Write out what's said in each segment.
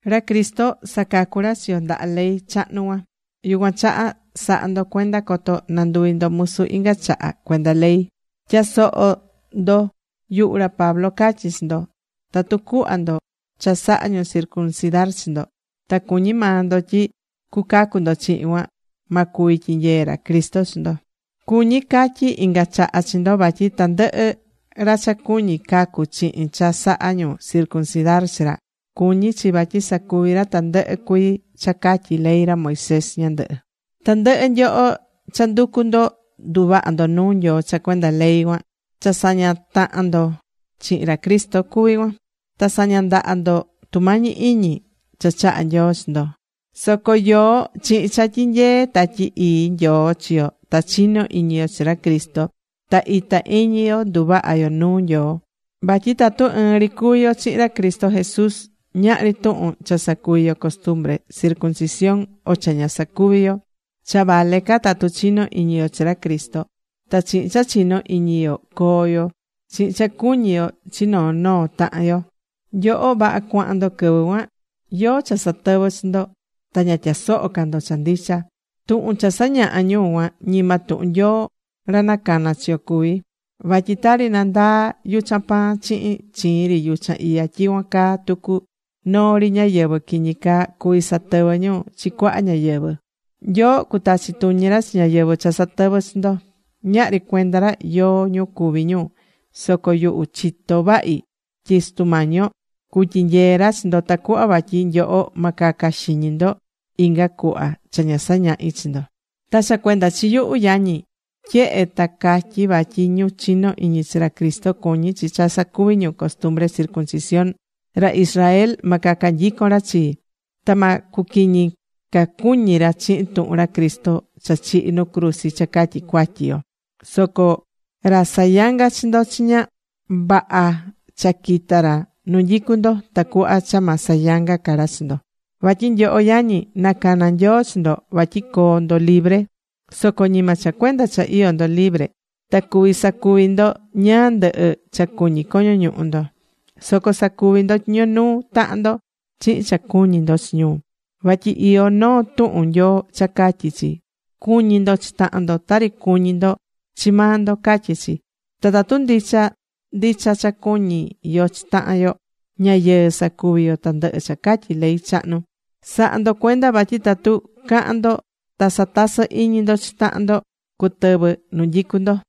Ra Cristo sacacu̱ ra chi yo ndaha ley chahnu cuan. Yucuan chaha sa̱ha ndo cuenda coto nanduvi ndo musu inga chaha cuenda ley. Tya̱soho ndo, yuhu ra Pablo catyi chi ndo. Tatu cuhva ndo cha saha ñu circuncidar chi ndo, ta cuñí maa ndo tyi cucacu ndo chihin cuan, ma cuvi tyinyee ra Cristo chi ndo. Cuñí catyi inga chaha chi ndo vatyi tandɨhɨ ra cha cuñí cacu chihin cha saha ñu circuncidar chi ra, cuñí chi vatyi sacuvi ra tandɨhɨ cuii cha catyí ley ra Moisés ñandɨhɨ. Tandɨhɨ nyoho cha nducú ndo nduvahá ndo nuu Nyoo cha cuenda ley cuan, cha sañá tahan ndo chihin ra Cristo cuví cuan. Ta sañá ndaha ndo tumañi iñi cha chahá Nyoo chi ndo. Soco yoó chihin cha tyinyeé Tatyi Ii Nyoo chi yo ta chinó iñi yo chi ra Cristo. Ta itá iñi yo nduvahá yo nuu Nyoo. Vatyi tatu ɨɨn ri cuví yo chihin ra Cristo Jesús, ñahri tuhun cha sacuvi̱ yo costumbre circumcisión, o cha ña sacuvi̱ yo. Cha vale ca tatu chinó iñi yo chi ra Cristo. Ta chihin cha chinó iñi yo coo yo, chihin cha cuñí yo chi noo noo tahan yo. Nyoho vaha cuahán ndo quɨvɨ cuan. ¿Yóó cha satɨvɨ̱ chi ndo? Ta ña tyasohó ca ndo cha ndicha. Tuhun cha sañahá ñu cuan, ñima tuhun Nyoo ra nacana̱ chi yo cuví. Vatyi tari nandaá yuchan pan chihin chiin ri yuchan iya, tyicuan caa tucu noo ri ñáyɨvɨ quiñi caa cuví satɨvɨ ñu chi cuaha ñáyɨvɨ. Nyoo cutachi tuñi ra chi ñáyɨvɨ cha satɨvɨ́ chi ndo. Ñahri cuenda ra yóó ñu cuví ñu. Soco yuhu chitó vahi tyi Sutu Mañi yo cutyinyee ra chi ndo tacuhva vatyi nyoho ma caca xiñi ndo inga cuhva cha ña sañahi̱ chi ndo. Ta cha cuenda chi yuhu, yañi, tyehe ta catyí vatyi ñu chinó ini chi ra Cristo cuñí chi cha sacuvi ñu costumbre circuncisión, ra Israel ma caca nyicon ra chii. Ta ma cuquiñi ca cuñi ra chihin tuhun ra Cristo cha chihi̱ nu cruzi cha catyi cuatyi yo. Soco ra sayangá chi ndo chiña, vaha cha quita ra nu nyicu ndo, tacuhva cha ma sayanga ca ra chi ndo. Vatyi nyoho, yañi, nacana̱ Nyoo chi ndo vatyi coo ndo libre. Soco ñima cha cuenda cha iyó ndo libre ta cuví sacuvi ndo ñáá ndɨhɨ cha cuñí coño ñuhu ndo. Soco sa̱cuvi ndo tyiño nuu tahan ndo chihin cha cuñí ndo chi ñu. Vatyi iyó noo tuhun Nyoo cha catyí chi: “Cu̱ñi ndo chi tahan ndo tari cuñí ndo chi maa ndo”, catyí chi. Ta tatu ndicha ndicha cha cuñí yo chi tahan yo, ña yɨɨ sacuví yo tandɨhɨ cha catyí ley chahnu. Sa̱ha ndo cuenda vatyi tatu cahán ndo ta satasɨ́ iñi ndo chi tahan ndo, cutɨvɨ nu nyicu ndo.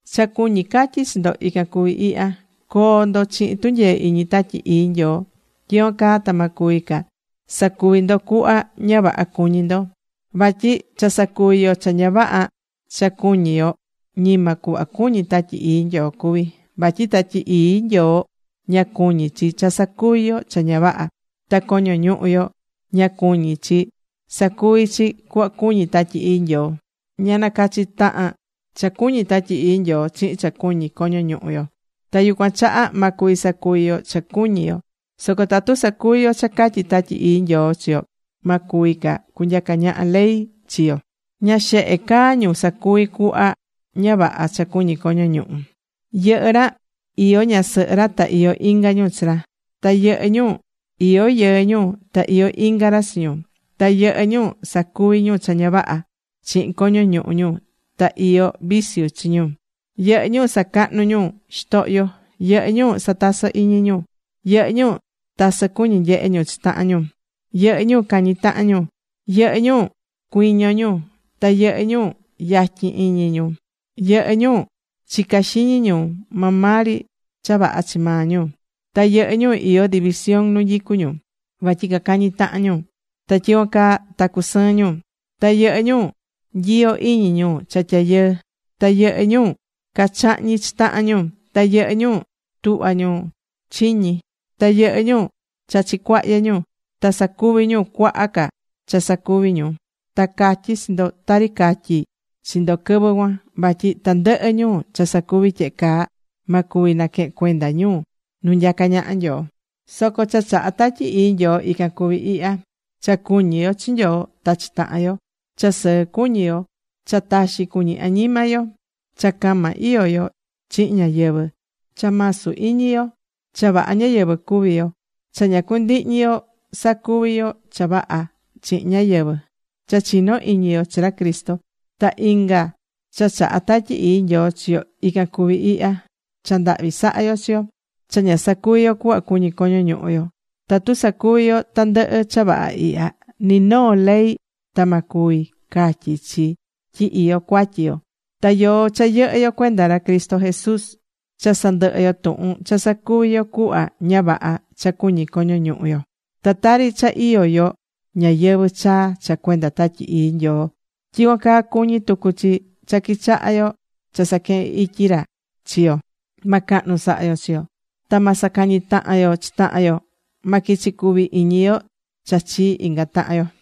Cha cuñí catyi chi ndo ican cuvi ihya: Co̱o ndo chihin tunyee iñi Tatyi Ii Nyoo. Tyicuan caa ta ma cuvi ca sacuví ndo cuhva ña vaha cuñí ndo. Vatyi cha sacuví yo cha ña vaha cha cuñí yo, ñima cuhva cuñí Tatyi Ii Nyoo cuví. Vatyi Tatyi Ii Nyoo ña cuñí chi cha sacuví yo cha ña vaha. Ta coño ñuhu yo ña cuñí chi sacuví chi cuhva cuñí Tatyi Ii Nyoo. Ña nacachí tahan cha cuñí Tatyi Ii Nyoo chihin cha cuñí coño ñuhu yo. Ta yucuan chaha ma cuvi sacuvi yo cha cuñí yo. Soco tatu sacuví yo cha catyí Tatyi Ii Nyoo chi yo, ma cuvi ca cunyaca ñaha ley chi yo. Ña xehe caa ñu sacuví cuhva ña vaha cha cuñí coño ñuhu. Yɨhɨ́ ra, iyó ñasɨhɨ ra ta iyó inga ñu chi ra. Ta yɨhɨ́ ñu iyó yɨɨ ñu ta iyó inga ra chi ñu. Ta yɨhɨ́ ñu sacuví ñu cha ña vaha chihin coño ñuhu ñu ta iyó viciu chi ñu. Yɨhɨ́ ñu sacahnú ñu xitohyo. Yɨhɨ́ ñu satasɨ́ ñu. Yɨhɨ́ ñu tasɨ cuñí nyehe ñu chi tahan ñu. Yɨhɨ́ ñu cañí tahan ñu. Yɨhɨ́ ñu cuiñó ñu. Ta yɨhɨ́ ñu yatyin iñi ñu. Yɨhɨ́ ñu chicá xiñi ñu maa maa ri cha vaha chi maa ñu. Ta yɨhɨ́ ñu iyó división nu nyicu ñu. Vatyi cacañí tahan ñu. Ta tyicuan caa ta cusɨɨ́n ñu. Ta yɨhɨ́ ñu nyiyó iñi ñu cha tyayɨɨ. Ta yɨhɨ́ ñu cachahñí chi tahan ñu. Ta yɨhɨ́ ñu tuhva ñu chiñi. Ta yɨhɨ́ ñu chachí cuahyɨ ñu. Ta sacuví ñu cuaha ca cha sacuví ñu. Ta catyí chi ndo tari catyi̱ chi ndo quɨvɨ cuan. Vatyi tandɨhɨ ñu cha sacuví tyehe caa ma cuvi naquehen cuenda ñu nu nyacá ñaha Nyoo. Soco cha chahá Tatyi Ii Nyoo, ican cuví ihya: cha cuñí yo chi Nyoo ta chi tahan yo, cha sɨɨ cuñí yo, cha taxi cuñí añima yo, cha cama iyó yo chihin ñáyɨvɨ, cha masu iñi yo, cha vaha ñáyɨvɨ cuvi yo, cha ña cundihñi yo sacuví yo cha vaha chihin ñáyɨvɨ, cha chinó iñi yo chi ra Cristo. Ta inga cha chahá Tatyi Ii Nyoo chi yo, ican cuví ihya: cha ndahvi sahá yo chi yo, cha ña sacuví yo cuhva cuñí coño ñuhu yo. Tatu sacuví yo tandɨhɨ cha vaha ihya, ni noo ley ta ma cuvi catyi chi tyi iyó cuatyi yo. Ta yoó cha yɨhɨ́ yo cuenda ra Cristo Jesús, cha sandɨhɨ̱ yo tuhun cha sacuvi̱ yo cuhva ña vaha cha cuñí coño ñuhu yo. Ta tari cha iyó yo ñayɨvɨ̱ chaa cha cuenda Tatyi Ii Nyoo, tyicuan caa cuñí tucu chi cha quichahá yo cha saquehen ityi ra chi yo. Ma cahnu saha yo chi yo. Ta ma sacañi tahan yo chi tahan yo. Ma quichi cuvi iñi yo cha chii inga tahan yo.